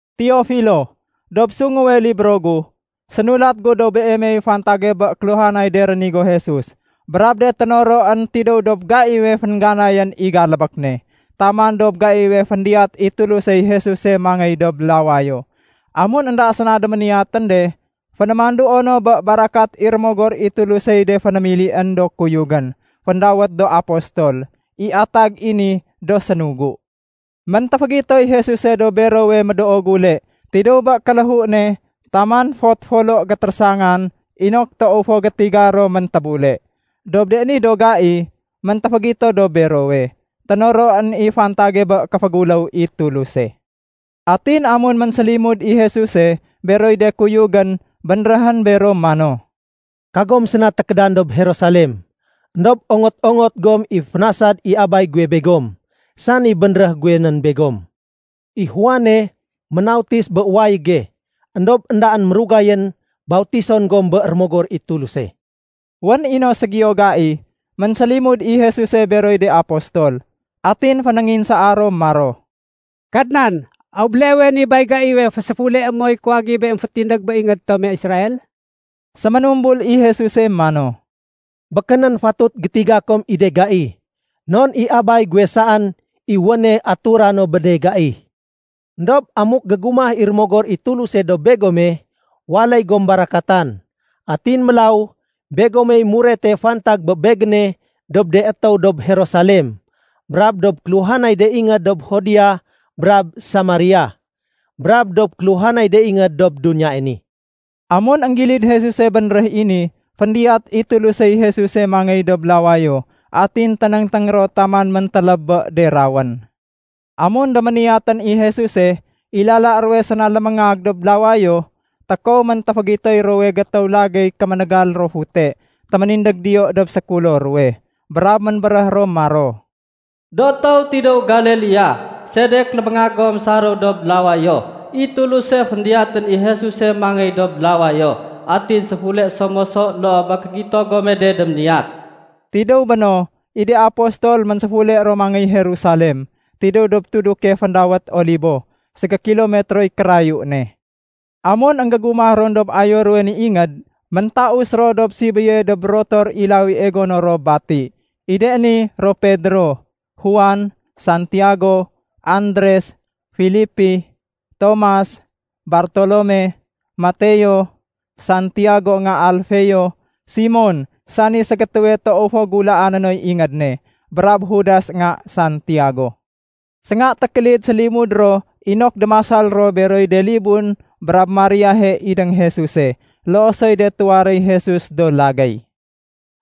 Teofilo, Dob sunguwe libro gu, sénulat gu dob beemey fantage bé kéluhanay de rénigo Jesus brab de ténoroén tidéw dob gaiwe féngganayén i kégalbék ne, taman dob gaiwe féndiyat i Tulusey Jesuse mangéy dob lawayo. Amun énda séna déméniyatén de, fénémanduo no bé barakat i Rémogor i Tulusey de fénémilién do kuyugén féndawét do Apostol (i atag i ni do sénugu). Méntéfégitoy Jesuse dob berowe médoo gule tidéw bé kéléhu ne taman fot folo gétérésangan inok toow fo gétiga ro méntébule. Dob de ni do gai méntéfégito dob berowe, ténoroén i fantage bé kéféguléw i Tuluse. Atin amun ménsélimud i Jesuse beroy de kuyugén bénréhén bero mano, “Kagom séna tékédan dob Jerusalem. Endob ongot-ongot gom i fénasad i Abay guwe begom, sani bénréh guwe nén begom. I Juane ménautis bé wayége éndob éndaén mérugayén bautison gom bé Rémogor i Tuluse.” Wén i no ségiyo gai ménsélimud i Jesuse beroy de apostol. Atin fénénginsaa ro maro, “Kadnan, aw béleewe ni bay gaiwe féséfuleé moy kuwagibe émfétindég bé ingéd tome Israel?” Séménumbul i Jesuse mano, “Békénén fatut gétiga kom i de gai non i Abay guwe saén i wéne aturano bé de gai. Endob amuk gégumah i Rémogor i Tuluse dob begome, waléy gom barakatan. Atin mélaw begomey murete fantag bé Begéne dob de étéw dob Jerusalem, brab dob kéluhanay de ingéd dob Judea brab Samaria, brab dob kéluhanay de ingéd dob duniyae ni.” Amun énggilid Jesuse bénréh i ni, féndiyat i Tulusey Jesuse mangéy dob lawayo atin ténéngténg ro taman méntéléb bé de rawén. Amun déméniyatén i Jesuse, i lala ruwe séna léméngag dob lawayo, tékow méntéfégitoy ruwowe gétéw lagéy kéménégal ro fute téménindég diyo dob sékulo ruwe. Brab ménbéréh ro maro, “Do étéw tidéw Galilea, sedek léméngag gom saréw dob lawayo? I Tuluse féndiyatén i Jesuse mangéy dob lawayo, atin séfule so moso loo bé kégito gome de déméniyat.” Tidéw béno, i de apostol ménséfule ro mangéy Jerusalem tidéw dob tuduke féndawét Olibo, ségékilometroy kérayu ne. Amun énggégumah ron dob ayo ruwe ni ingéd, méntaus ro dob sibéye dob rotor i lawie gono ro bati. I de ni ro Pedro, Juan, Santiago, Andres, Filipi, Tomas, Bartolome, Mateo, Santiago nga Alfeo, Simon sani ségétéwe toow fo gulaané noy ingéd ne, brab Judas nga Santiago. Sénga tékélid sélimud ro inok démasal ro beroy de libun brab Mariahe idéng Jesuse, loo soy de tuwaréy Jesus do lagéy.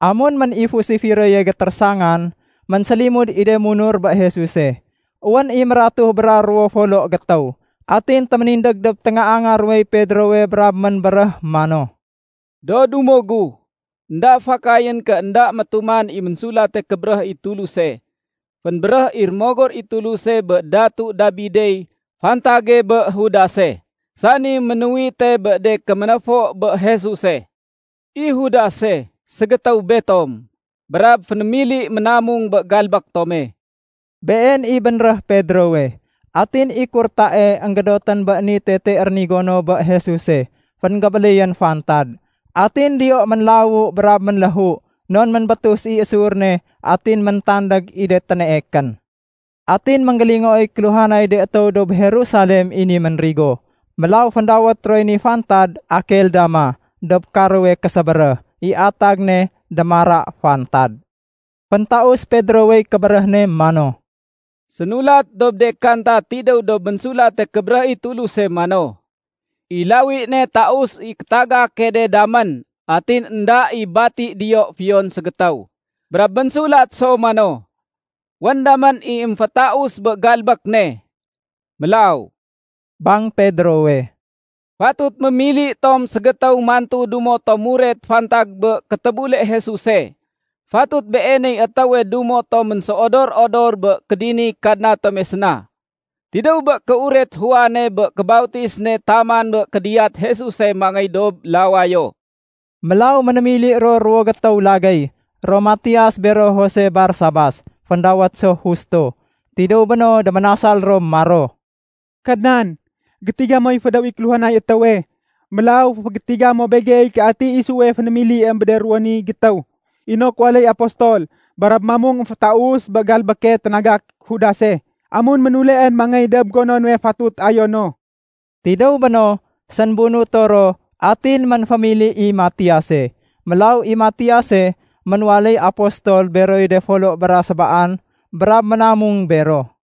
Amun ménifus i firoye gétérésangan, ménsélimud i de munur bé Jesuse, wén i mératuh bra ruwo folo gétéw. Atin téménindég dob téngaanga ruwey Pedrowe brab ménbéréh mano, “Do dumo gu, énda fakayén ké énda métuman i Ménsulate Kébéréh i Tuluse, fénbéréh i Rémogor i Tuluse bé Datu Dabidey fantage bé Judase, sani ménuwite bé de kéménéfo bé Jesuse. I Judase, ségétéw betom, brab fénémili ménamung bé galbék tome.” Been i bénréh Pedrowe. Atin i kurtae énggédotén bé ni tete rénigo no bé Jesuse fénggébéléyén fantad, atin diyo ménlawu brab ménléhu non ménbétus i sur ne atin méntandég i de téneekén. Atin énggélingooy kéluhanay de étéw dob Jerusalem i ni ménrigo, mélaw féndawét roy ni fantad “Akeldama”, dob karowe késébéréh. (I atag ne “Démara fantad”.) Féntaus Pedrowey kébéréh ne mano, “Sénulat dob de Kanta tidéw dob Ménsulate Kébéréh i Tuluse mano, ‘I lawi ne taus i kétagake de damén atin énda i bati diyo fiyon ségétéw.’ Brab ménsulat so mano, ‘Wén damén i émfétaus bé galbék ne.’ “Mélaw,” bang Pedrowe, “fatut mémili tom ségétéw mantu dumo tom muret fantag bé kétébule Jesuse. Fatut beeney étéwe dumo tom ménséodor-odor bé kédiniy Kadna tome séna, tidéw bé kéuret Juane bé kébautis ne taman bé kédiyat Jesuse mangéy dob lawayo.” Mélaw ménémili ro ruwo gétéw lagéy, ro Matias bero Jose Barsabas (féndawét so Justo). Tidéw béno déménasal ro maro, “Kadnan, gétiga moy fédéw i kéluhanay étéwe. Mélaw féfégétiga mo begey ké ati isuwe fénémiliém bé de ruwo ni gétéw, inok waléy apostol brab mamung émfétaus bé galbéke ténagak Judase amun ménuleén mangéy dob gonone fatut ayono.” Tidéw béno, sénbunuto ro atin ménfémili i Matiase. Mélaw i Matiase ménwaléy apostol beroy de folo bra sébaan, brab ménamung bero.